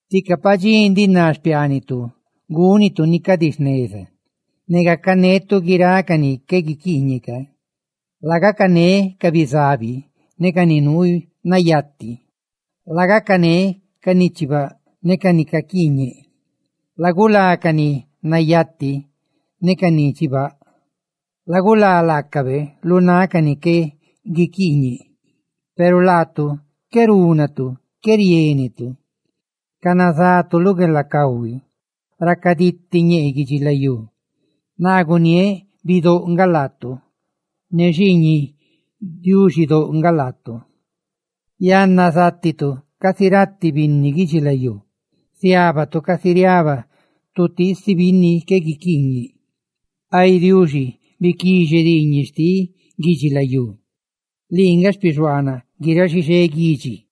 «Tica padxí ndiꞌ ná xpiaanitu gúnitu ni cadi jneza, ne gacanetu guiráꞌ ca ni qué guiquiiñeꞌ ca. ¡Lagacané ca bizabi ne ca ni nuu nayati! ¡Lagacané ca ni chibaꞌ ne ca ni caquiiñeꞌ! ¡Lagulá ca ni nayati ne ca ni chibaꞌ, lagulá laacabe lu náꞌ ca ni qué guiquiiñe! »Peru laatu qué rúnatu, qué riénetu; canazatu lu gueelacahui. Racaditi ñee guidxilayú. Naa guniéꞌ: bidóꞌ nga laatu; ne xiiñiꞌ Diuxidóꞌ nga laatu. Yanna, zátitu casi ratiꞌ binni guidxilayú, ¡ziábatu casi riaba tutiisi binni qué guiquiiñe!» ¡Ay Diuxi, biquixe diiñeꞌ xtiꞌ guidxilayú, lii nga xpixuaanaꞌ guiráꞌ xixé guidxi!